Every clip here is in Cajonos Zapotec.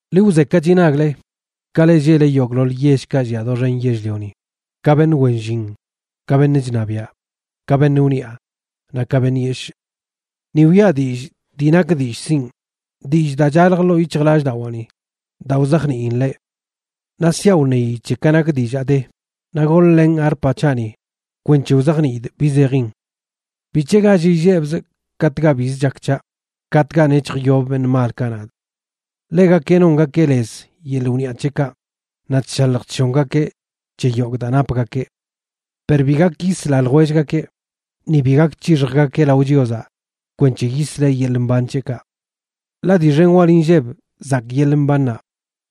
Ḻi wzekachi nagle, ka leꞌ lleꞌle yogꞌḻoḻ yellkaꞌ llia doxen yell-lioni, ka beṉꞌ wen llin, ka beṉꞌ chṉabiaꞌ, ka beṉꞌ wniꞌa naꞌ ka beṉꞌ yeshꞌ. Ni wiꞌa dillꞌ dii nak dillꞌ sinꞌ, dillꞌ daa chalj ḻoo yic̱hjlallꞌdawaani daa wzajniin leꞌ. Naꞌ siaꞌ wṉeyi c̱he ka nak dillaa de, naꞌ goḻ-lenꞌ arpa c̱haꞌni kwenc̱he wzajniidꞌ bi zejin. ¿Bic̱he gall illebzꞌ katꞌkaꞌ biz chak c̱haꞌ, katꞌkaꞌ nec̱hjyob beṉꞌ malkaꞌ nadꞌ? Ḻegakeꞌ nongakeꞌ lez yeḻꞌ wniꞌa c̱heꞌkaꞌ naꞌ chshalj chshongakeꞌ c̱he yogꞌ daa napgakeꞌ. Per bi gak yisla ljwellgakeꞌ, ni bi gak c̱hixjgakeꞌ lao Chiozaꞌ kwenc̱he yisleꞌ yeḻꞌ mban c̱heꞌkaꞌ. Ḻaꞌ dii xen wal inlleb zakꞌ yeḻꞌ mbannaꞌ,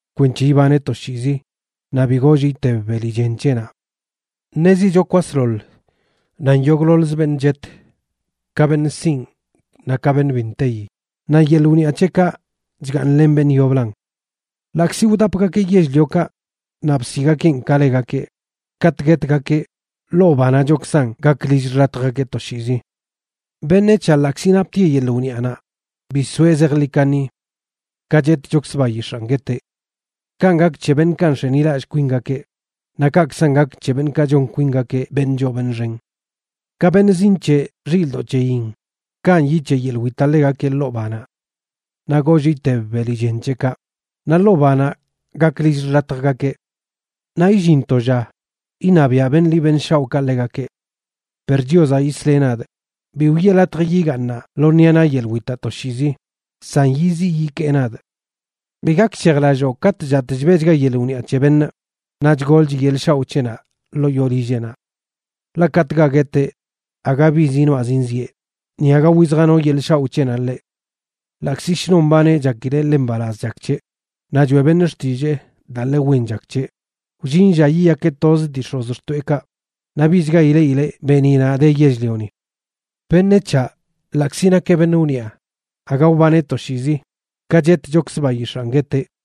kwenc̱he ibaneꞌ toshiizi naꞌ bi goollꞌ iteb beli chen c̱heꞌnaꞌ. Ṉezicho kwasḻoḻ nan yogꞌḻoḻz beṉꞌ chet, ka beṉꞌ sinꞌ, naꞌ ka beṉꞌ bi nteyi, naꞌ yeḻꞌ wniꞌa c̱heꞌkaꞌ chgaaṉlen beṉꞌ yoblan. Ḻaꞌkzi wdapgakeꞌ yell-liokaꞌ naꞌ bsiꞌgakeꞌn ka legakeꞌ, katꞌ guetgakeꞌ, ḻoo banaꞌchokzan gak lill xḻatjgakeꞌ toshiizi. Beṉec̱haꞌ, ḻaꞌkzi naptieꞌ yeḻꞌ wniꞌanaꞌ, bi soeꞌ zejḻi kaṉi. Ka chetchokzə bayix̱aan gueteꞌ. Kanꞌ gak c̱he beṉꞌkaꞌ nx̱enilallꞌ kwingakeꞌ; naꞌ kaꞌkzan gak c̱he beṉꞌkaꞌ chon kwingakeꞌ beṉꞌ choo beṉꞌ xen. Ka beṉꞌ zinc̱heꞌ xilꞌdoꞌ c̱heyin, kanꞌ yic̱heꞌ yeḻꞌ witaꞌ ḻegakeꞌ ḻoo banaꞌ. Naꞌ goollꞌ iteb beli chen c̱heꞌkaꞌ, naꞌ ḻoo banaꞌ gak lill xḻatjgakeꞌ. Naꞌ illin to lla iṉabiaꞌ beṉꞌ ḻi beṉꞌ shaoꞌkaꞌ ḻegakeꞌ. Per Chiozaꞌ yisleꞌ nadꞌ; bi wiꞌe latj yigaaṉaꞌ lo ṉiꞌa naꞌ yeḻꞌ witaꞌ toshiizi, san yiziꞌ yikee nadꞌ. Bi gakshejlalloo katꞌ chatꞌ chbeꞌchga yeḻꞌ wniꞌa c̱he beṉꞌ, naꞌ chgolch yeḻꞌ shaoꞌ c̱heꞌnaꞌ ḻoo yoo lilleꞌnaꞌ. Ḻaꞌ katꞌkaꞌ gueteꞌ aga bi zinoaꞌ zinzieꞌ, ni aga wizjano yeḻꞌ shaoꞌ c̱heꞌnaꞌ ḻeꞌ. Ḻaꞌkzi shnon mbaneꞌ chakileꞌ ḻe mbalaz chak c̱heꞌ, naꞌ choeꞌ beṉꞌ xtillee daa ḻe wen chak c̱heꞌ, wllin lla yiyakeꞌ toz dii x̱ozxtoeꞌkaꞌ, naꞌ bichga ileꞌileꞌ beeniꞌnaꞌ de yell-lioni. Beṉec̱haꞌ, ḻaꞌkzi nakeꞌ beṉꞌ wniꞌa, aga wbaneꞌ toshiizi, ka chetchokzə bayix̱aan gueteꞌ.